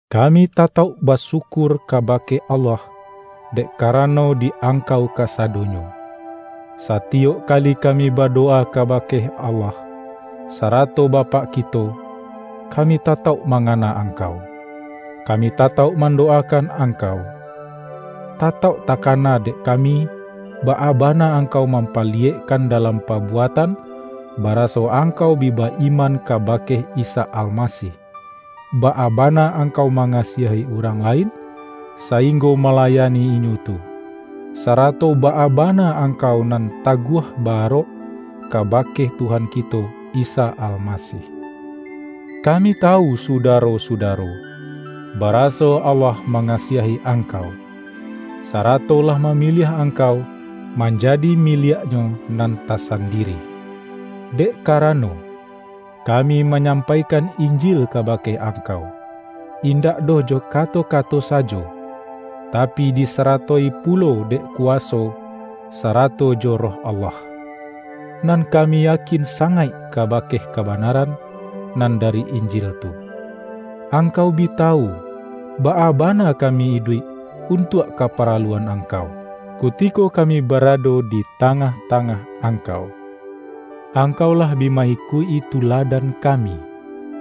Kami tatauk basyukur kabake Allah dek karano di angkau kasado-nyo. Satiyok kali kami badowa kaba-ke Allah, sarato Bapak kito, kami ta-tauk mangana angkau. Kami tatauk mandowakan angkau. Tatauk taka-na dek kami, baa bana angkau mam-paliyekkan dalam pabuatan, baraso angkau bi ba-iman kabake Isa Al-masih, baa bana angkau mangasiahi urang lain, sainggo malayani inyo tu, sarato baa bana angkau nan ta-guah ba-arok, kabake Tuhan kito Isa Almasih. Kami tawu sudaro-suda-ro, baraso Allah mangasiahi angkau, sarato lah mamiliah angkau manjadi miliak-Nyo nan tasandiri. Dek ka-rano, kami manyampaikan Injil ka-bake angkau, indak doh jo kato-kato sajo, tapi disarato-i pulo dek kuwaso sarato jo Roh Allah. Nan kami yakin sangaik kabake kabanaran nan dari Injil tu. Angkau bi tawu, baa bana ka-mi iduik untuak kaparaluan angkau, kutiko kami barado di tangah-tangah angkau. Angkau lah bi ma-ikuik-i tuladan kami,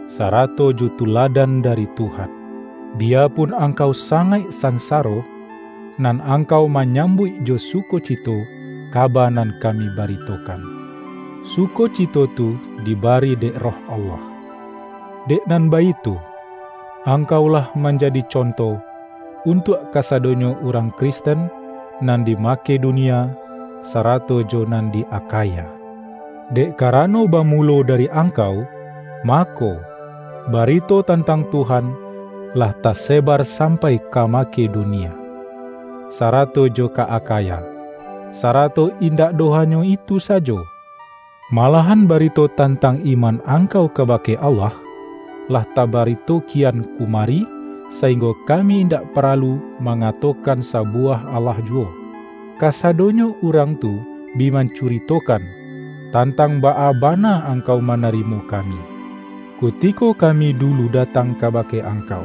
sarato jo tuladan dari Tuhan. Biyapun angkau sangaik san-saro, nan angkau manyambuik jo su-kocito kaba nan kami baritokan. Su-kocito tu dibari dek Roh Allah. Dek nan baitu, angkau lah manjadi con-to, untuak kasadonyo urang Kristen nan di Makedonia, sarato jo nan di Akhaya. Dek karano bamulo dari angkau, mako, barito tantang Tuhan lah tasebar sampai ka Makedonia, sa-rato jo ka Akhaya. Sarato indak doh hanyo itu sajo; malahan barito tan-tang iman angkau kabake Allah, lah tabarito kian kumari, sainggo kami indak paralu mangatokan sabuwah alah juwo. Kasadonyo urang tu bi mancuritokan, tantang baa bana ang-kau manarimo kami, kutiko kami du-lu datang kabake angkau.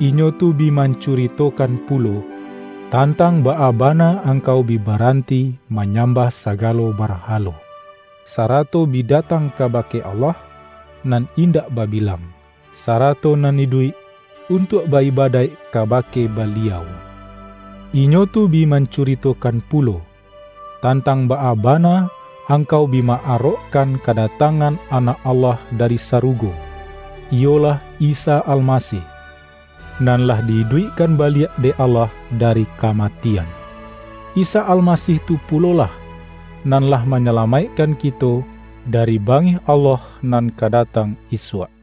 Inyo tu bi mancuritokan pulo, tantang baa ba-na angkau bi baranti manyambah sa-galo barhalo, sarato bi datang kabake Allah, nan indak babilang, sarato nan iduik, untuak ba-ibadaik kabake Ba-liau. Inyo tu bi mancuritokan pu-lo, tantang baa bana angkau bi ma-arokkan kadatangan Anak Allah dari sarugo, iyolah Isa Almasih, nan lah di-iduikkan baliak dek Allah dari ka-matian. Isa Almasih tu pulolah, nan lah manyalamaikkan kito dari ba-ngih Allah nan ka datang isuak.